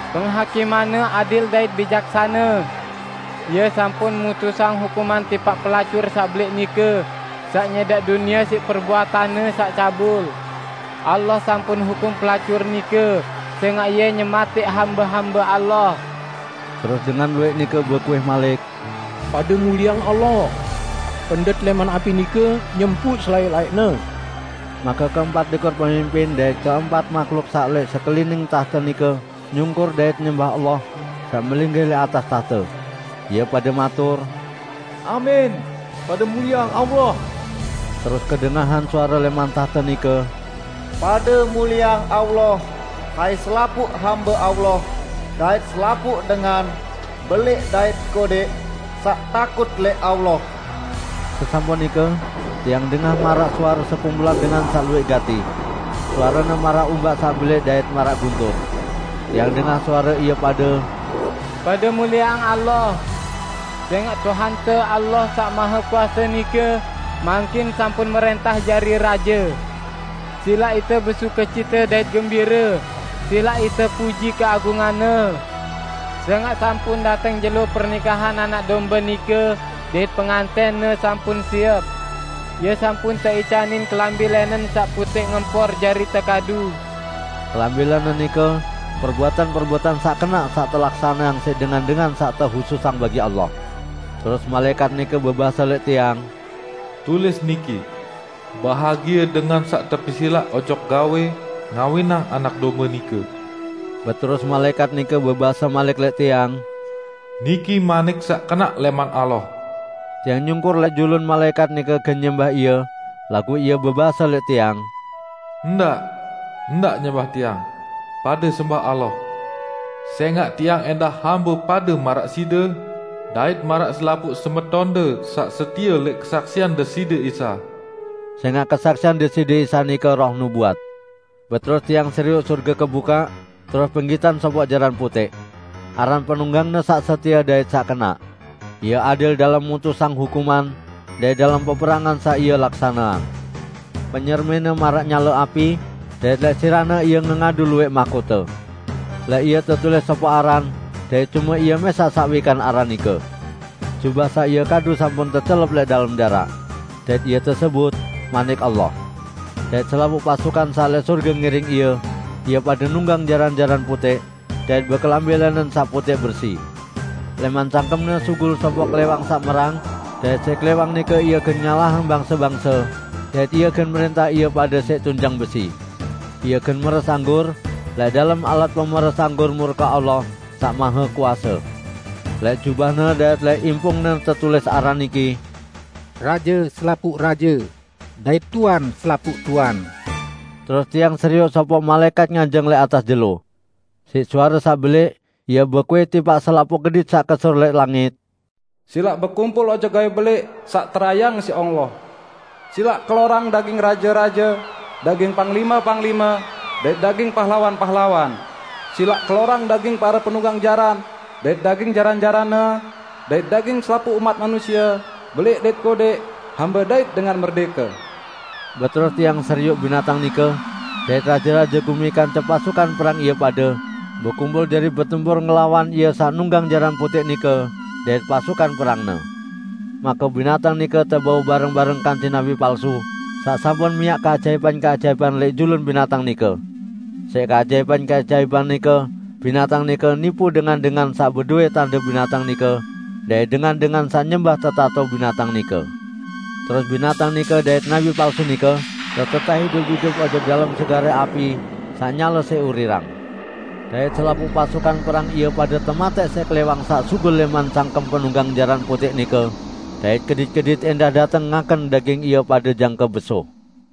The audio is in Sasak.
Penghakimanne adil dait bijaksane! Ie sampun mutusang hukuman tipaq pelacur saq belẽq nike, saq nyẽdaq dunie siq perbuatanne saq cabul. Allah sampun hukum pelacur nike, sẽngaq ie nyematẽq hambe-hambe Allah." Terus dengan luwẽq nike bekuih malik, "Pade mulieang Allah! Pendet lẽman api nike nyempuq selaẽq-laẽqne!" Make keempat likur pemimpin dait keempat mahluk saq lẽq sekelining tahte nike nyungkur dait nyembah Allah saq melinggih lẽq atas tahte. Ie pade matur, "Amin! Pade mulieang Allah!" Terus kedengahan suare lẽman tahte nike, "Pade mulieang Allah, hai selapuq hambe Allah, dait selapuq dengan -- belẽq dait kodẽq -- saq takut lẽq Allah!" Sesampun nike tiang dengah maraq suare sekumpulan dengan saq luwẽq gati; suarene maraq umbak saq belẽq dait maraq guntur. Tiang dengah suare ie pade, "Pade mulieang Allah! Sẽngaq Tuhante, Allah Saq Mahekuase nike, mangkin sampun mrẽntah jari raje! Silaq ite besukecite dait gembire; silaq ite puji keagungan-Ne! Sẽngaq sampun dateng jelo pernikahan Anak Dombe nike, dait pengantẽn-Ne sampun siep. Ie sampun teicanin kelambi lẽnen saq putẽq ngempor jari tekadu." (Kelambi lẽnen nike perbuatan-perbuatan saq kenaq saq telaksaneang siq dengan-dengan saq tehususang bagi Allah.) Terus malaẽkat nike bebase lẽq tiang, "Tulis niki: 'Bahagie dengan saq tepesilaq ojok gawẽ ngawinang Anak Dombe nike.' " Beterus malaẽkat nike bebase malik lẽq tiang, "Niki manik saq kenaq lẽman Allah." Tiang nyungkur lẽq julun malaẽkat nike gen nyembah ie, laguq ie bebase lẽq tiang, "Ndaq! Ndaq nyembah tiang, pade sembah Allah! Sẽngaq tiang ẽndah hambe pade maraq side dait maraq selapuq semetonde saq setie lẽq kesaksian Deside Isa!" Sẽngaq kesaksian Deside Isa nike roh nubuat. Beterus tiang serioq sorge kebukaq, terus penggitan sopoq jaran putẽq. Aran penunggang-Ne Saq Setie dait Saq Kenaq. Ie adil dalem mutusang hukuman dait dalem peperangan saq Ie laksaneang. Penyermin-Ne maraq nyale api dait lẽq sirah-Ne Ie ngengadu luwẽq mahkote. Lẽq Ie tetulis sopoq aran; dait cume Ie mẽsaq saq wikan aran nike. Jubah saq Ie kadu sampun tecelep lẽq dalem daraq. Dait Ie tesebut "Manik Allah". Dait selapuq pasukan saq lẽq sorge ngiring Ie; ie pade nunggang jaran-jaran putẽq, dait bekelambi lẽnen saq putẽq bersi. Lẽman cangkem-Ne sugul sopoq klẽwang saq merang dait siq klẽwang nike Ie gen ngalahang bangse-bangse, dait Ie gen mrẽntah ie pade siq tunjang besi. Ie gen meres anggur lẽq dalem alat pemeres anggur murke Allah Saq Mahekuase. Lẽq jubah-Ne dait lẽq impung-Ne tetulis aran niki, "Raje selapuq raje, dait Tuan selapuq tuan." Terus tiang serioq sopoq malaẽkat nganjeng lẽq atas jelo. Siq suare saq belẽq ie bekuih tipaq selapuq kedit saq kesur lẽq langit, "Silaq bekumpul ojok gawẽ belẽq saq terayeang siq Allah! Silaq kelorang daging raje-raje, daging panglime-panglime, dait daging pahlawan-pahlawan; silaq kelorang daging pare penunggang jaran dait daging jaran-jaranne, dait daging selapuq umat manusie, belẽq dait kodẽq, hambe dait dengan merdẽke!" Beterus tiang serioq binatang nike, dait raje-raje gumi kance pasukan perang ie pade, bekumpul jari betempur ngelawan Ie saq nunggang jaran putẽq nike dait pasukan perang-Ne. Make binatang nike tebau bareng-bareng kance nabi palsu saq sampun miaq keajaipan-keajaipan lẽq julun binatang nike. (Siq keajaipan-keajaipan nike binatang nike nipu dengan-dengan saq bedowẽ tande binatang nike dait dengan-dengan saq nyembah tetato binatang nike.) Terus binatang nike dait nabi palsu nike tetetẽh idup-idup ojok dalem segare api saq nyale siq urirang. Dait selapuq pasukan perang ie pade tematẽq siq klẽwang saq sugul lẽman cangkem penunggang jaran putẽq nike; dait kedit-kedit ẽndah dateng ngaken daging ie pade jangke besuh.